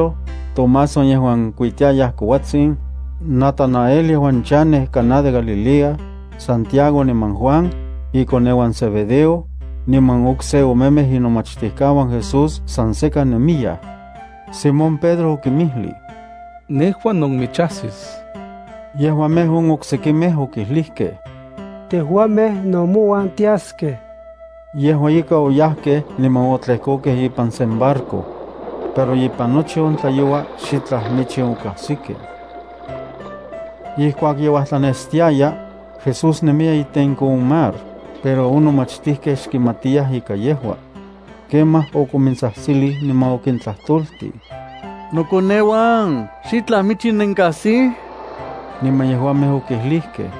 Simón Pedro, Tomás, on yejuan kuitiayaj kouatsin, Natanael yejuan chanej Caná de Galilea, Santiago niman Juan, ikoneuan Zebedeo, niman okse omemej inomachtijkauan Jesús san sekan nemiyaj. Simón Pedro okinmijlij: —Nejua nonmichajsis. Yejuamej on oksekimej okijlijkej: —Tejuamej no mouan tiaskej. Yejua ika oyajkej niman otlejkokej ipan sen barco. Pero ipan nochi on tlayoua xitlaj michin okajsikej. Ijkuak ye uajtlanestiaya, Jesús nemiya itenko on mar, pero on nomachtijkej xkimatiyaj ika yejua. Kemaj okomintsajtsilij niman okintlatoltij: —Nokoneuan, ¿xitlaj michin nenkajsij? Niman yejuamej okijlijkej: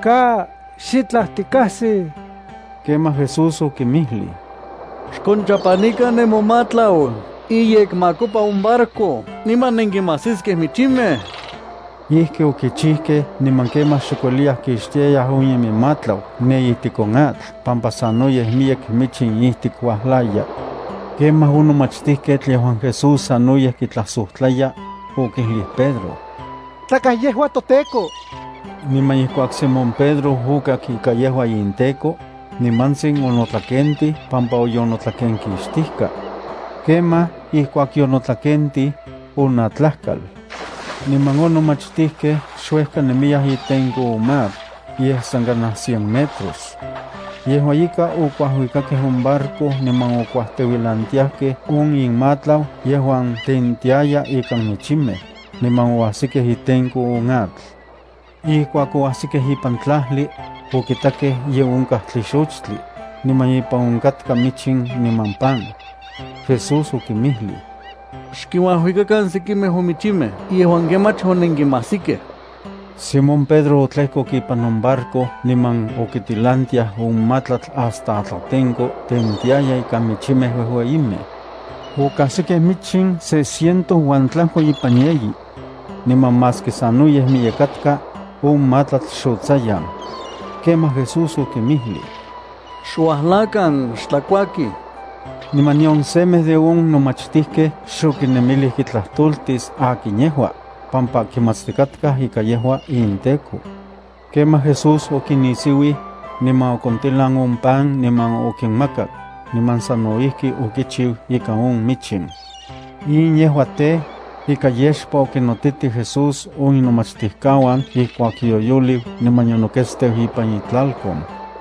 —Ka, xitlaj tikajsij. Kemaj Jesús okinmijlij: —Xkonchapanikan nemomatlau iyekmakopa on barco niman nenkimajsiskej michimej. Ijki okichijkej niman kemaj xok ueliyaj kixtiayaj on inmatlau ne ijtik on atl pampa sanoyej miyek michin ijtik uajlaya. Kemaj on nomachtijketl yejuan Jesús sanoyej kitlajsojtlaya, okijlij Pedro: —¡Tlakaj yejua toTEKO! Niman ijkuak Simón Pedro okak ika yejua inTEKO, nimantsin onotlakentij pampa onotlakenkixtijka. Kemaj, ijkuak yonotlakentij, onatlajkal. Niman on nomachtijkej xuejka nemiyaj itenko on mar, yej san kanaj cien metros. Yejua ika okuajuikakej on barco niman okuajteuilantiajkej on inmatlau yejuan tentiaya ikan michimej, niman oajsikej itenko on atl. Ijkuak oajsikej ipan tlajli, okitakej ye onkaj tlixochtli, niman ipan onkatka michin niman pan. Jesús okinmijlij: —Xkinuajuikakan sekimej on michimej yejuan kemach onenkinmajsikej. Simón Pedro otlejkok ipan on barco niman okitilantiaj on matlatl hasta atlatenko tentiaya ikan michimej uejueyimej. Okajsikej michin se ciento uan tlajko ipan yeyi. Niman maski sanoyej miyek katka, on matlatl xotsayan. Kemaj Jesús okinmijlij: —Xuajlakan, xtlakuakij. Niman nion semej de on nomachtijkej xokinemilij kitlajtoltis akin yejua, pampa kimatstikatkaj ika yejua inTEKO. Kemaj Jesús okinnisiuij, niman okontilan on pan niman okinmakak, niman sano ijki okichiu ikan on michin. In yejua tej, ika yexpa okinnotitij Jesús on inomachtijkauan ijkuak yoyoliu niman yonoketsteu ipan itlalkon.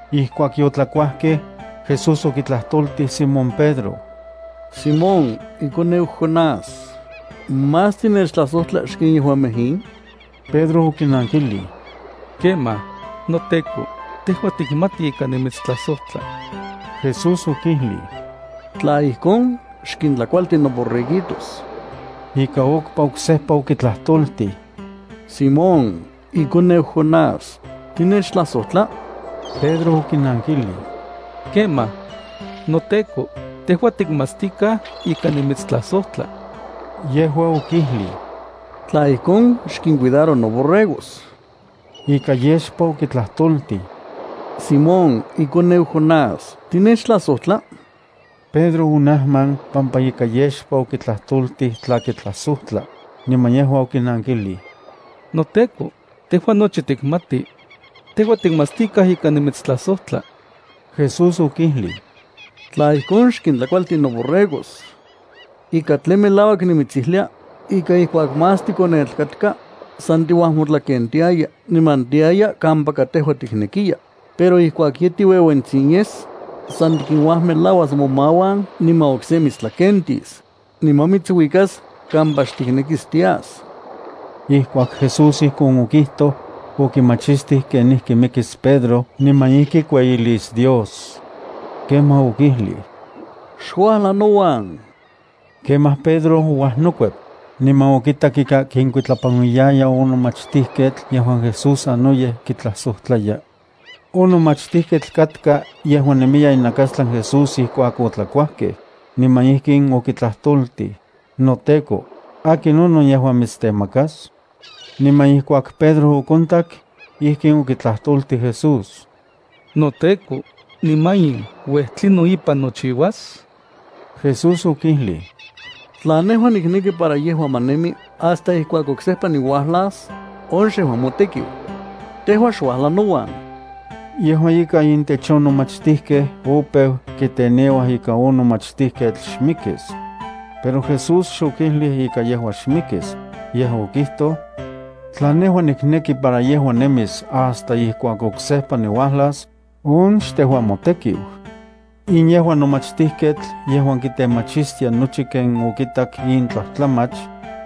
Ijkuak yotlakuajkej, Jesús okitlajtoltij Simón Pedro: —Simón, ikoneu Jonás, ¿más tinechtlajsojtla xken yejuamej in? Pedro okinankijlij: —Kemaj. NoTEKO, tejua tikmati ika nimitstlajsojtla. Jesús okijlij: —Tla ijkon xkintlakualti noborreguitos. Ika okpa oksejpa okitlajtoltij: —Simón, ikoneu Jonás, ¿tinechtlajsojtla? Pedro okijnankijlij: —Kemaj. NoTEKO, tejua tikmatstikaj ika nimitstlajsojtla. Yejua okijlij: —Tla ijkon xkincuidaro noborregos. Ika yexpa okitlajtoltij: —Simón, ikoneu Jonás, ¿tinechtlajsojtla? Pedro onajman pampa ika yexpa okitlajtoltij tla kitlajsojtla, niman yejua okinankijlij: —NoTEKO, tejua nochi tikmati. Tejua tikmatstikaj ika nimitstlajsojtla. Jesús okijlij: —Tla ijkon xkintlakualti noborregos. Ika tlen melauak nimitsijlia ika ijkuak más tikonetl katka, san tiuajmotlakentiaya niman tiaya kampaka tejua tiknekiya, pero ijkuak ye tiueuentsin yes, san tikinuajmelauas momauan niman okse mitstlakentis, niman mitsuikas kampa xtiknekis tias. Ijkuak Jesús ijkon okijtoj, okimachistij kenijki mikis Pedro niman ijki kueyilis Dios. Kemaj okijlij: —¡Xuajla nouan! Kemaj Pedro ouajnokuep, niman okitak ika kikuitlapanuiya on nomachtijketl yejuan Jesús sanoyej kitlajsojtlaya. (On nomachtijketl katka yejuan nemiya inakastlan Jesús ijkuak otlakuajkej, niman ijkin okitlajtoltij: “NoTEKO, ¿akinonon yejuan mitstemakas?”) Niman ijkuak Pedro okontak, ijkin okitlajtoltij Jesús: —NoTEKO, niman in uej, ¿tlinon ipan nochiuas? Jesús okijlij: —Tla nejua nikneki para yejua ma nemi hasta ijkuak oksejpa niuajlas, on xejua motekiu. Tejua xuajla nouan. Yejua ika intech on nomachtijkej opeu kiteneuaj ika on nomachtijketl xmikis. Pero Jesús xokijlij ika yejua xmikis, yej okijtoj: “Tla nejua nikneki para yejua nemis hasta ijkuak oksejpa niuajlas, on xtejua motekiu.” In yejua nomachtijketl yejuan kitemachistia nochi ken okitak in tlajtlamach,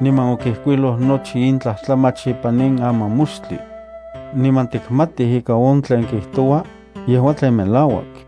niman okijkuiloj nochi in tlajtlamach ipan in amamoxtli. Niman tikmatij ika on tlen kijtoua, yejua tlen melauak.